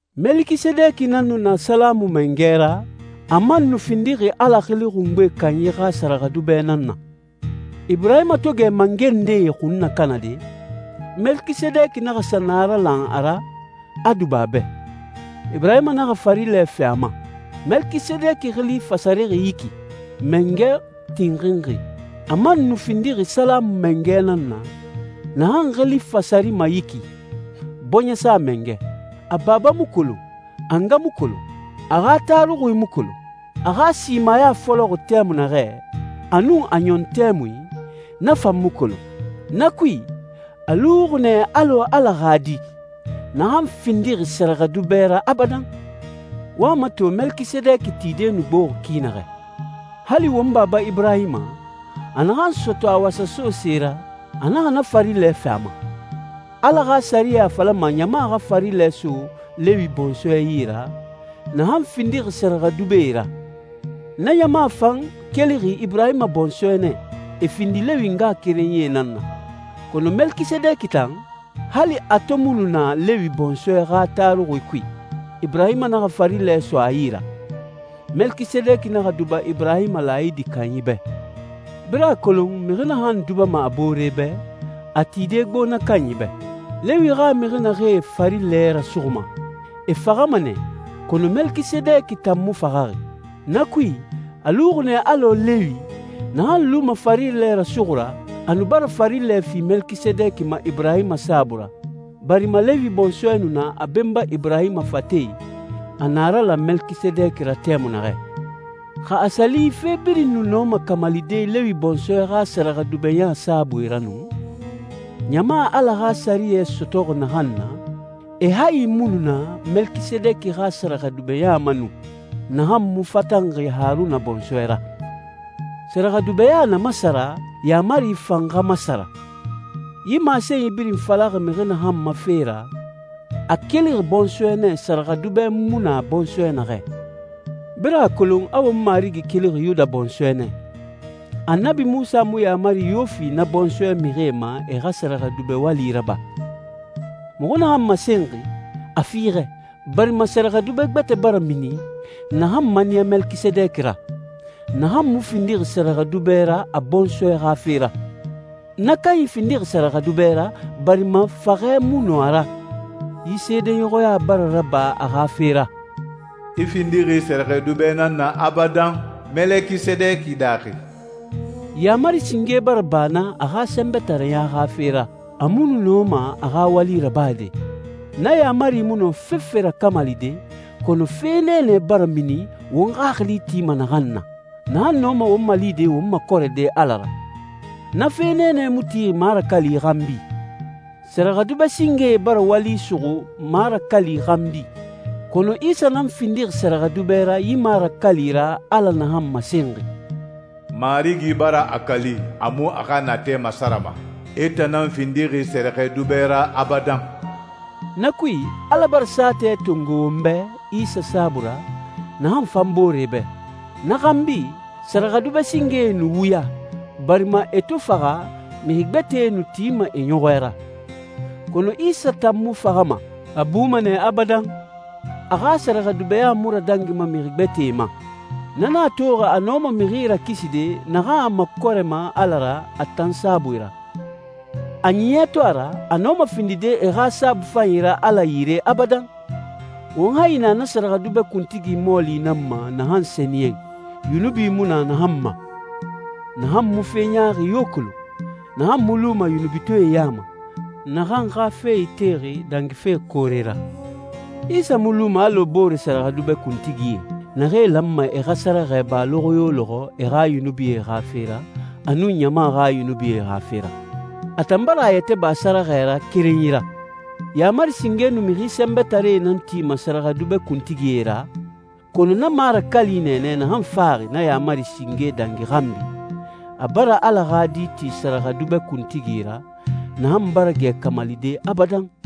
Melekisedeki nan nu na Salamu mangɛ ra, a man nu findixi Ala Xili Xungbe Kanyi xa sɛrɛxɛdubɛ nan na. Iburahima to gɛ mangɛ ndee xun nakanade, Melekisedeki naxa sa naralan a ra, a duba a bɛ. Iburahima naxa farilɛ fi a ma. Melekisedeki xili fasarixi yi ki «mangɛ tinxinxi.» A man nu findixi Salamu mangɛ nan na, naxan xili fasarima yi ki «bɔɲɛsa mangɛ.» A baba mu kolon, a nga mu kolon, a xa taruxui mu kolon. A xa simaya fɔlɔxi tɛmui naxɛ, a nun a ɲɔn tɛmui, na fan mu kolon. Na kui, a luxi nɛ alɔ Ala xa Di, naxan findixi sɛrɛxɛdubɛ ra abadan. Wo a mato Melekisedeki tide nu gboxi ki naxɛ. Hali won baba Iburahima, a naxan sɔtɔ a wasaso se ra, a naxa na farilɛ fi a ma. Ala xa sɛriyɛ a falama ɲama xa farilɛ so Lewi bɔnsɔɛ yi ra, naxan findixi sɛrɛxɛdubɛe ra. Na ɲama fan kelixi Iburahima bɔnsɔɛ nɛ, e findi Lewi ngaxakerenyie nan na. Kɔnɔ Melekisedeki tan, hali a to mu nu na Lewi bɔnsɔɛ xa taruxui kui, Iburahima naxa farilɛ so a yi ra. Melekisedeki naxa duba Iburahima laayidi kanyi bɛ. Birin a kolon mixi naxan dubama a boore bɛ, a tide gbo na kanyi bɛ. Lewi xa mixi naxee farilɛ rasuxuma, e faxama nɛ, kɔnɔ Melekisedeki tan mu faxaxi. Na kui, a luxi nɛ alɔ Lewi, naxan luma farilɛ rasuxu ra, a nu bara farilɛ fi Melekisedeki ma Iburahima saabui ra, barima Lewi bɔnsɔɛ nu na a benba Iburahima fate i, a naralan Melekisedeki ra tɛmui naxɛ. Xa a sa li fe birin nu nɔma kamalide Lewi bɔnsɔɛ xa sɛrɛxɛdubɛɲa saabui ra nu, ɲama Ala xa sɛriyɛ sɔtɔxi naxan na, e hayi mu nu na Melekisedeki xa sɛrɛxɛdubɛɲa ma nu, naxan mu fatanxi Haruna bɔnsɔɛ ra. Sɛrɛxɛdubɛɲa na masara, yaamari fan xa masara. Yi masenyi birin falaxi mixi naxan ma fe ra, a kelixi bɔnsɔɛ nɛ sɛrɛxɛdubɛ mu na bɔnsɔɛ naxɛ. Birin a kolon a won Marigi kelixi Yuda bɔnsɔɛ nɛ. Annabi Munsa mu yaamari yo fi na bɔnsɔɛ mixie ma e xa sɛrɛxɛdubɛ wali raba. Muxu naxan masenxi, a fiixɛ, barima sɛrɛxɛdubɛ gbɛtɛ bara mini, naxan maniya Melekisedeki ra, naxan mu findixi sɛrɛxɛdubɛ ra a bɔnsɔɛ xa fe ra. Na kanyi findixi sɛrɛxɛdubɛ ra, barima faxɛ mu nɔ a ra. Yi seedeɲɔxɔya bara raba a xa fe ra, «I findixi sɛrɛxɛdubɛ nan na abadan, Melekisedeki daaxi.» Yaamari singe bara ba na a xa sɛnbɛtareya xa fe ra, a mu nu nɔma a xa wali rabade. Na yaamari mu nɔ fefe rakamalide, kɔnɔ fe nɛɛnɛ bara mini won xaxili tima naxan na, naxan nɔma won malide won makɔrɛde Ala ra. Na fe nɛɛnɛ mu tixi marakali xanbi. Sɛrɛxɛdubɛ singee bara wali suxu marakali xanbi, kɔnɔ Isa nan findixi sɛrɛxɛdubɛ ra yi marakali ra Ala naxan masenxi, «Marigi bara a kali, a mu a xa natɛ masarama: I tan nan findixi sɛrɛxɛdubɛ ra abadan.» Na kui, Ala bara saatɛ tongo won bɛ Isa saabui ra, naxan fan boore bɛ. Na xanbi, sɛrɛxɛdubɛ singee nu wuya, barima e to faxa, mixi gbɛtɛe nu tima e ɲɔxɔɛ ra. Kɔnɔ Isa tan mu faxama, a buma nɛ abadan. A xa sɛrɛxɛdubɛɲa mu radangima mixi gbɛtɛe ma. Na nan a toxi a nɔma mixi rakiside naxan a makɔrɛma Ala ra a tan saabui ra. A ɲiɲɛ to a ra, a nɔma findide e xa saabui fanyi ra Ala yire abadan. Won hayi na na sɛrɛxɛdubɛ kuntigi mɔɔli nan ma naxan sɛniyɛn, yunubi mu na naxan ma, naxan mu fe ɲaaxi yo kolon, naxan mu luma yunubitɔɛe ya ma, naxan xa fe itexi dangife koore ra. Isa mu luma alɔ boore sɛrɛxɛdubɛ kuntigie, naxee lanma e xa sɛrɛxɛ ba lɔxɔ yo lɔxɔ e xa yunubie xa fe ra, a nun ɲama xa yunubie xa fe ra. A tan bara a yɛtɛ ba sɛrɛxɛ ra kerenyi ra. Yaamari singe nu mixi sɛnbɛtaree nan tima sɛrɛxɛdubɛ kuntigie ra, kɔnɔ na marakali nɛɛnɛ naxan faxi na yaamari singe dangi xanbi, a bara Ala xa Di ti sɛrɛxɛdubɛ kuntigi ra, naxan bara gɛ kamalide abadan.